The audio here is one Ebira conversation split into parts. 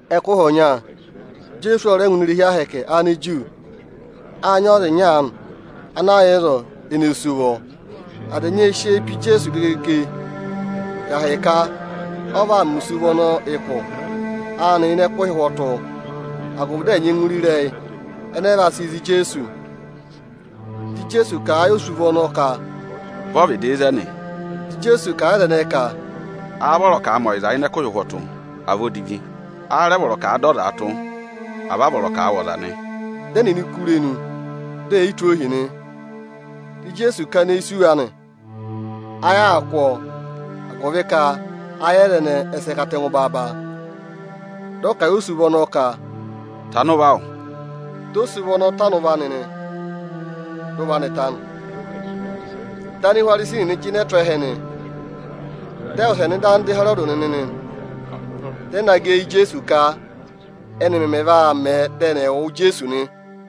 Ẹkụhị ọnya Ijeesu ọ rẹ ngụ ini irehi ahẹkẹ Aniju. Â nyị ọza ịnya aanị ana yà ịzọọ ene sú ụvọ. Aza ẹnyị ệ sị eyi pe Ijeesu gegege ka ahịka ọ vaa mẹ osuvọ ọnọọ ụkụ anị ịnị ẹkụhị ụhwọtụ, agụvị dị ẹ̀ nyẹngụ re ịrẹyị ẹnẹ ẹ vaa sị za Ijeesu. Dị Ijeesu kà a yị osuvọ ọnọọ ka, “Vẹ ọvịdị ịzẹnị!” Ịjị ọ vẹ dị Ijeesu kà a yị aza ẹnẹẹ ka, “Áá vọrọ ka à mẹ ọyịza ịnị ẹkụhị ụhwọtụ, à vị odivi? Áá rẹ vọrọ ka à dọ ọza tụ́, à vị a vọrọ ka à wụ̀ ọza nị?” Dị ẹnịnị kú irenu, dị è yi tụ́ ohi nị. Dị Ijeesu kana eyi sì wa nị, ayị aa kụ́ ọọ, agụvị ka ayị aza ẹnẹẹ ẹ sị katẹngụ baaba. Dị ọ kà a yị osuvọ ọnọọ ka, “Tana ụvọ awụ!” Dị osuvọ ọnọọ tana ụvọ anị, dị ụvọ anị ta nị. Dị Anihwarisi nịnị jịnẹ tụ́ ẹhẹ nị, dị ẹ wụsẹ nọ ịda ogu Ịhẹrọdị nịnị, dị ẹ naa gẹ eyi Ijeesu ka ẹ́nị mẹmẹ vaa mẹ, dị ẹnị ẹ̀ wụ ọ nị.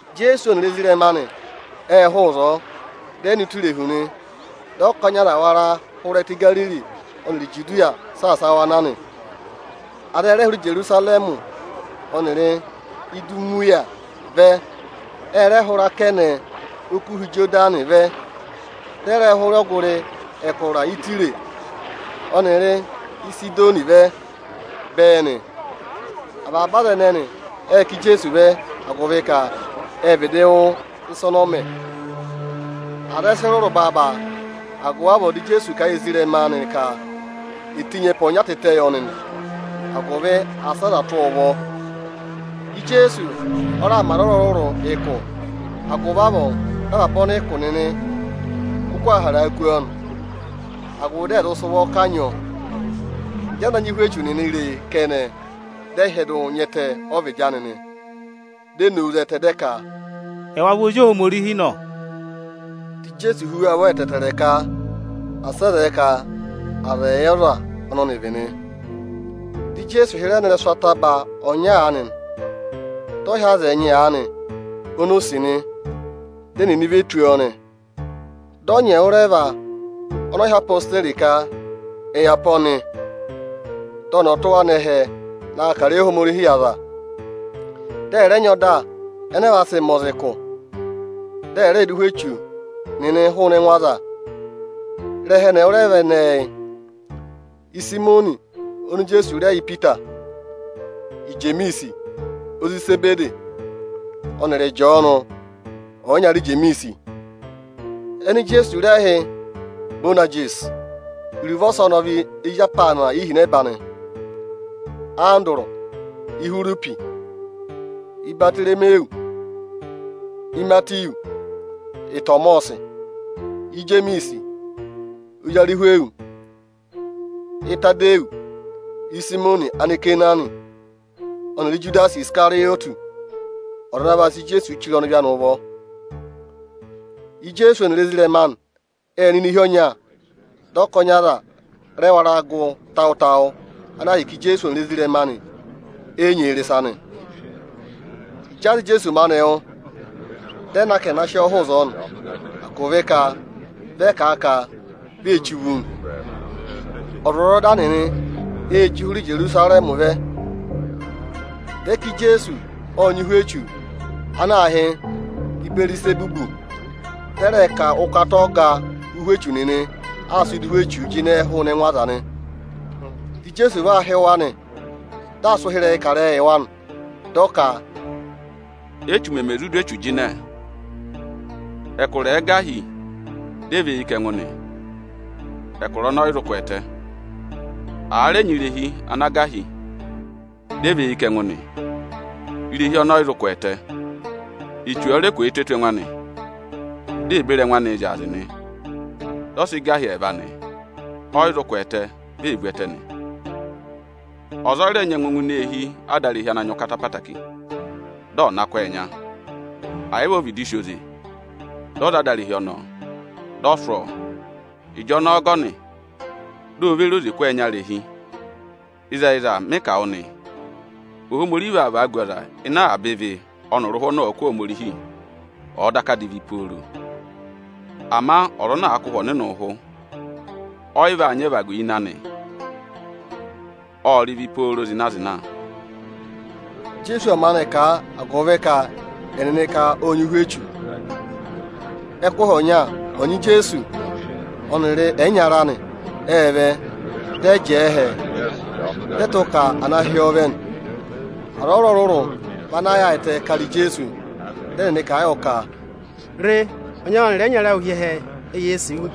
Ijeesu ọnịrị ezirẹma anị ệ hụụ ịzọọ, dị ẹ nọ ụtọ irehu nị. Dị ọkọnị aza wara hụrẹ ẹtẹ Igariri ọnịrị Ijudiya saasa wa na nị. Aza ẹ rẹ hụrẹ Ijerusarẹmị ọnịrị Idumiya vẹ, ẹ rẹ hụrẹ akẹnẹ Okuha Ịjọdanị vẹ, dị ẹ rẹ hụrẹ ọgụrị ẹkụra Ịtaya ọnịrị Ịsịdọnị vẹ bẹẹ nị. Avaba aza ẹnẹnị ệ ká Ijeesu vẹ, agụvị ka ệ vịdị wụ́ ịsa ọnọọ mẹ. Aza ẹ sị rụrụ baaba; agụvị avọọ dị Ijeesu kà a yị ezirẹma anị ka è tenyi ẹpa ọnya tịtẹ yọ nị, agụvị asị aza tụ́ ọọ ụvọ nị. Ijeesu ọ raà mẹ aza ọrụrụ-ọrụrụ ụkụ; agụvị avọọ dị avaba ọnịkụ nịnị kụkụ aa haraa kú ọ nị, agụvị dị ẹ̀ zụ sị ụvọ kanyị ọ. Ịjị aza ana nyị ụhwẹ echu nịnị re e kẹnẹ, dị ẹ hyẹdụ nya ẹtẹ ọ́ vịdị anị, di e nowu zẹtẹ, dị ẹ ka, “Ẹwa vị Ozi Ohomorihi nọ!” Dị Ijeesu hú wa ụvọ ẹtẹẹtẹrẹ ka asị ẹ zẹẹ ka aza ẹ̀ yẹ ọza ọnọ ọnị vị nị. Dị Ijeesu hịrẹ nọ ịrẹsụ ataba ọnya aanị, dị ọ hị́ aza ẹnyị aanị oni o sì nị; dị ẹnịnị ve tù ọ nị. Dị ọ nyị ẹnị ẹwụrẹva ọnọọ hị́ odeyi ka ẹ̀ yà pe ọnị, dị ọnị ọ̀ tụ́ wa nọ ẹhẹ na kà ịrẹyị Ohomorihi yị aza, dị ẹ̀ nyị ọda ẹnẹẹ vaa sị mẹ aza ụkụ, dị ẹ̀ rẹẹ dụ ụhwẹ echu nịnị hụụnị ẹngụ aza. Ịrẹha ẹnị ẹwụrẹva ẹnẹẹ yị: Ịsayịmọnị oni Ijeesu rẹ yị Ipita, Ijemiisi, ozi Izebedi, ọnịrị Ịjọọnụ ọyịnyara Ijemiisi, ẹnị Ijeesu rẹ hị́ “Iboyanagisi” (iruvo ọsọnị ọ vị “ezi apaana ihinẹba”), Andụrụ, Ihwiripi, Ibatoromiwu, Imatiwu, Ịtọmọsị, Ijemiisi ozi Arịhwịyọsị, Ịtadịyọsị, Ịsayịmọnị Anikenaani, ọnịrị Ijudasi Isikarịyọtị, ọza ana vana sị Ijeesu chire ọnịvị anị ụvọ. Ijeesu ọnịrị ezirẹma anị ệ nọ ini eehi ọnya, dị ọkọnị aza rẹ sị wara gụ tawụ-tawụ, ana ahịka Ijeesu ọnịrị ezirẹma anị e yi nyị eyi rị ịsa nị. Ịjị aza anị Ijeesu maanị wụ́, dị ẹ na ka ẹnị ẹ̀ na sị ọọ hụụ ịzọọ nị, agụvị ka vị aza kà a ka vi ee che uvu nị. Ọzwọzọda nịnị ê chí hụrẹ Ijerusarẹmị vẹ, dị ẹ ka Ijeesu ộ nyị ụhwẹ echu ana aā hị́ “Ịbẹẹrịzẹbụ”, dị ẹ rẹ ka ụkata ọga ụhwẹ echu nịnị aa sịị dụ ụhwẹ echuu jịnẹẹ hụụnị ẹngụ aza nị. Dị Ijeesu va hị́ wa nị, dị aa sị ụhịrẹyịị kà ịrẹyịị yị wa nị. Dị ọ ka, “Échu mẹmẹ zụ dụ echu jịnẹ?” Ẹkụra ẹ̀ẹ gà hi dị ẹ và eyi kà ẹngụ nị, ẹkụra ọnọọ ọ yị zụ kwẹẹtẹ. Àa rẹ nyị irehi ana gà hi dị ẹ và eyi kà ẹngụ nị, irehi ọnọọ ọ yị zụ kwẹẹtẹ. Echu ọ̀ọ rẹ kwẹẹtẹ tù ẹngụ anị, di ee beri ẹngụ anị zyaazị nị, dị ọ sị gà hi ẹẹva nị, ọ yị zụ kwẹẹtẹ, vi ee vu ẹtẹ nị. “Ọza ẹ yị rẹ nyẹngụ ngụ ini eehi adarehi ana nyị ụkata ẹtẹẹtẹrẹ, dị ọ̀ na kụ́ ọọ ẹnya; ẹ yị vị o vịdị sì oze dị ọ̀ za adarehi ọnọọ, dị ọ̀ sụ́ ọọ, ịjọnọọ ọgọnị di ò ve re oze kụ́ ọọ ẹnya irehi. “Ịzẹyịza, mị kà wụ nị, Ohomorihi vaa vagu ọza ịnị avaba ịvị ọnịrị ụhụ ọnị ọ̀ọ kụ̀ Ohomorihi, ọ̀ọ daka divi pooro; ama ọza ana àa kụ̀ Ụhwẹ Ọnịnị ụhụ, ọ yị va nyị ẹvagu ịnị anị, ộ rị ịvị pooro zịna-zịna.” Ijeesu ộ maanị kà, agụvị ka ẹnịnị ka ộ nyị ụhwẹ echu. Ẹkụhị ọnya ọnyị Ijeesu ọnịrị ẹyịnyara anị ệ vẹ, dị ẹ jẹẹ ẹhẹ, dị ẹ tụ́ ka à na hị́ ọọ vẹ nị. Aza ọrụrụ-ọrụrụ vị ana yaayịtẹ kara Ijeesu, dị ẹnịnị kà a yọ ka, “Re, ọnyị awụ ọnịrị ẹyịnyara awụ hi ẹhẹ, eyee sì wu.”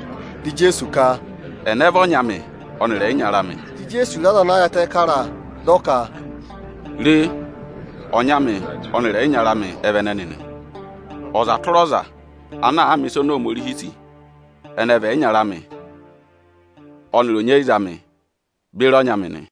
Dị Ijeesu ka, “Ẹnẹ vị ọnyị amị ọnịrị ẹyịnyara amị?” Dị Ijeesu re aza ana yaayịtẹ kara a, dị ọ ka, “Re, ọnyị amị ọnịrị ẹyịnyara amị ẹ vị ẹnẹnị nị. Ọza tụra ọza ana àa mẹ̀ ịsa oni Ohomorihi sì, ẹnị ẹ vị ẹyịnyara amị ọnịrị onyeyiza amị beri ọnyị amị nị.”